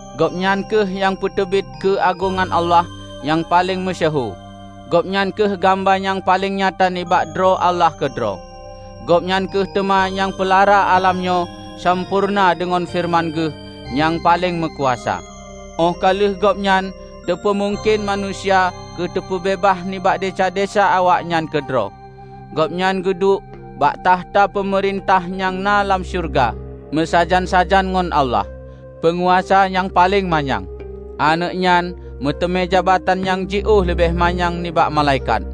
Gobnyan kheueh nyang peuteubiet keu agongan Allah nyang paleng meusyeuhu; Gobnyan kheueh gamba nyang paleng nyata nibak droe Allah keudroe. Gobnyan kheueh teuma nyang peulara alam nyoe sampoereuna deungon feureuman Geuh nyang paleng meukuasa. Óh ka lheueh Gobnyan teupeumungken manusia keuteupeubeubaih nibak desya-desya awaknyan keudroe, Gobnyan geuduek bak tahta peumeurintah nyang na lam syeuruga meusajan-sajan ngon Allah, Peunguasa nyang paleng manyang. Aneuëk nyan meuteumé jabatan nyang jiôh leubeh manyang nibak malaikat,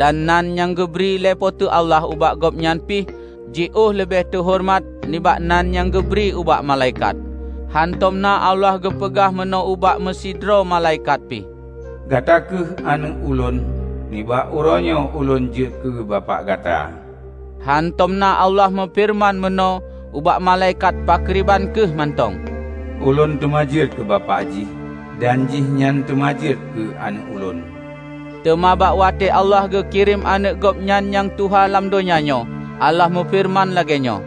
dan nan nyang geubri lé Po teu Allah ubak Gobnyan pih jiôh leubeh teuhoreumat nibak nan nyang geubri ubak malaikat. Hántom na Allah geupeugah meunoe ubak meusidroe malaikat pi, "Gata kheueh Aneuëk Ulôn; nibak uroenyoe ulôn jeuet keu Bapak gata." Hántom na Allah meufeureuman meunoe ubak malaikat pakriban kheueh mantong, "Ulôn teuma jeuet keu Bapak jih, dan jihnyan teuma jeuet keu Aneuëk Ulôn." Teuma bak watée Allah geu kirém Aneuëk Gobnyan nyang tuha lam donya nyoe, Allah meufeureuman lagée nyoe,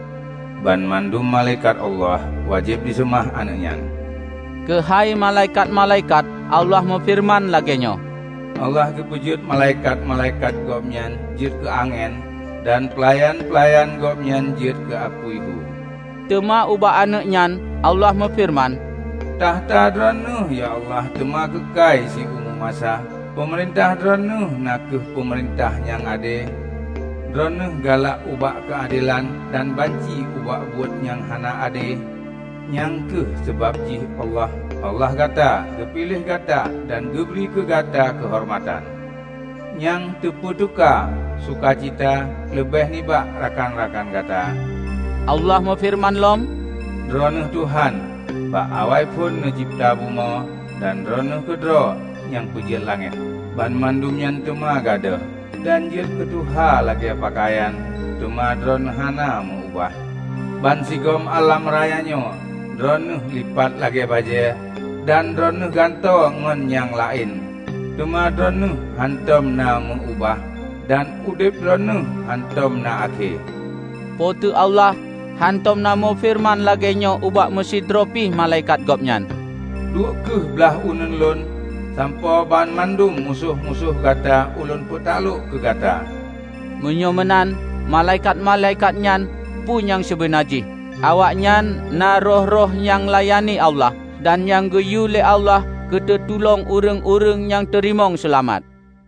"Banmandum malaikat Allah wajéb jiseumah Aneuëk nyan." Keuhai malaikat-malaikat Allah meufeureuman lagée nyoe, "Allah geupeujeuet malaikat-malaikat Gobnyan jeuet keu angén, dan peulayan-peulayan Gobnyan jeuet keu apui hu." Teuma ubak Aneuëk nyan Allah meufeureuman, "Takhta Droeneueh, ya Allah, teuma keukai siumu masa! Peumeurintah Droeneueh na kheueh peumeurintah nyang ade. Droeneueh galak ubak keuadelan, dan banci ubak buet nyang hana ade; nyang kheueh sabab jih Allah, Allah Gata, geupiléh Gata dan geubri keu Gata keuhoreumatan nyang teupeuteuka suka cita, leubeh nibak rakan-rakan Gata." Allah meufeureuman lom, "Droeneueh, Tuhan, bak awaiphon neucebta bumoe, dan Droeneueh keudroe nyang peujeuet langét. Banmandum nyan teuma gadôh, dan jeuet keu tuha lagée peukayan; teuma Droeneueh hana meu ubah. Bansigom alam raya nyoe Droeneueh lipat lagée bajée, dan Droeneueh gantoe ngon nyang laén. Teuma Droeneueh hántom na meu-ubah, dan udeb Droeneueh hántom na akhé." Po teu Allah hántom na meufeureuman lagée nyoe ubak meusidroe pi malaikat Gobnyan, "Duek kheueh blaih uneuen Lôn, sampoe banmandum musoh-musoh gata Ulôn peutaklok keu gata." Meunyoe meunan, malaikat-malaikat nyan peue nyang sibeuna jih? Awaknyan na roh-roh nyang layani Allah, dan nyang geuyue lé Allah keuteutulông ureuëng-ureuëng nyang teurimong seulamat.